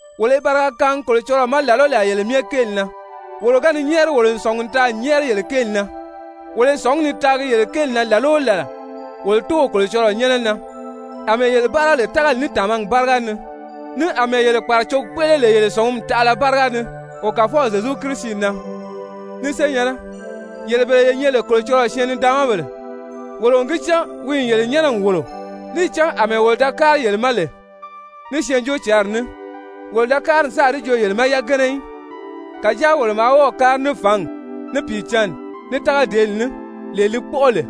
Wolo i bariga kaangi Kolocɔlɔɔ ma làla o làla yele myɛ kéeli na, wolo ga ni nyɛ́ɛri, wolo n sɔ̀ngi n taa n nyɛ́ɛri yele kéeli na. Wolo i sɔ̀ngí ni taagi yele kéeli na làla o làla wolo Tóow Kolocɔlɔɔ nyɛ́nɛ na, àmɛɛ yele báara lè tágali ní tàmagi báriga ni, ní àmɛɛ yele kpàracogi kpéʔele lè yele sɔ̀ngumi taʔala báriga ni wo Kàfɔw Zyezu Kirisi na. Ni senyɛ̀nnɛ, yele bele ye nyɛ lè Kolocɔlɔɔ syɛɛn-nidaanmabèle, wolo n gi cán wi n yele nyɛ́nɛ n wòlo. Níì cán àmɛɛ wolo da kári yele ma lè ní Syɛɛnjóocǎnri ní, wolo da kári n sáà di joo yele ma yagana í, kàjáa wolo maa wɔ́ɔ̀ kári ní fǎngi, ní Pìicǎnni, ní tágadeeli ní, lee li kpɔ́ʔɔ lè.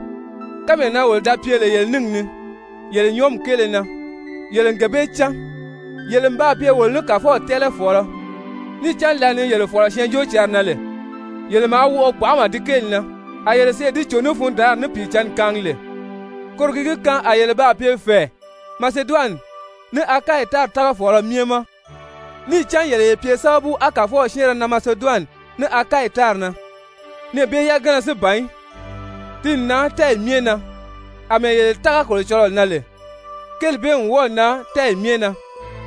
Kánmee na wolo da pye lè yele níngi ni yele nyɔɔmi kéele na, yele n gee bee cán. Yele n baa pye wolo ní Kàfɔw tɛ́ɛlɛfɔɔlɔ, níì cán lǎli ni yele fɔ̀lɔ Syɛɛnjóocǎnri na lè, yele maa wɔʔɔ gbanʔama di kéeli na, a yele sèʔê di cò ní fundaanri ní Pìicǎnni kaangi lè. Koro ki gi kaan a yele baa pye fɛ̀ɛ Maseduwani ní Akayi tári tágafɔɔlɔ myɛ ma. Níì cán yele ye pye sábabu á Kàfɔw syɛ́ɛnrɛ nan Maseduwani ní Akayi tári na, nɛɛ bee yagana si ban í, ti n nan tɛ́ɛyi myɛ na, àmɛɛ yele tága Kolocɔlɔɔ na lè, kéeli bee n wɔ́ɔ̀ nan tɛ́ɛyi myɛ na,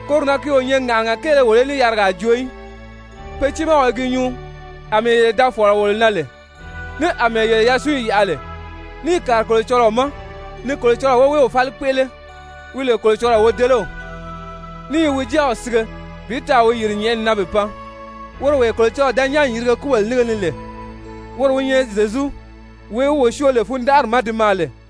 koro na ki o nyɛ ŋàʔanaga kéele wolo í ní yarigaa joo í. Pe tiimaa i gi nyuu àmɛɛ yele da fɔ̀lɔ wolo na lè, ní àmɛɛ yele yasunyi yaʔa lè níì kàri Kolocɔlɔɔ ma ni Kolocɔlɔɔ woweew fáli kpéʔele, wi lè Kolocɔlɔɔ wodelew, ní i wi Jáaw sige bi taa wi yìri nyɛ̀ʔɛni na bi pan, woro wee Kolocɔlɔɔ da nyán n yirige kúbèle nínge ni lè, woro wi nyɛ Zyezu, wee wi wo syoo lè fundanʔari ma di maa lè.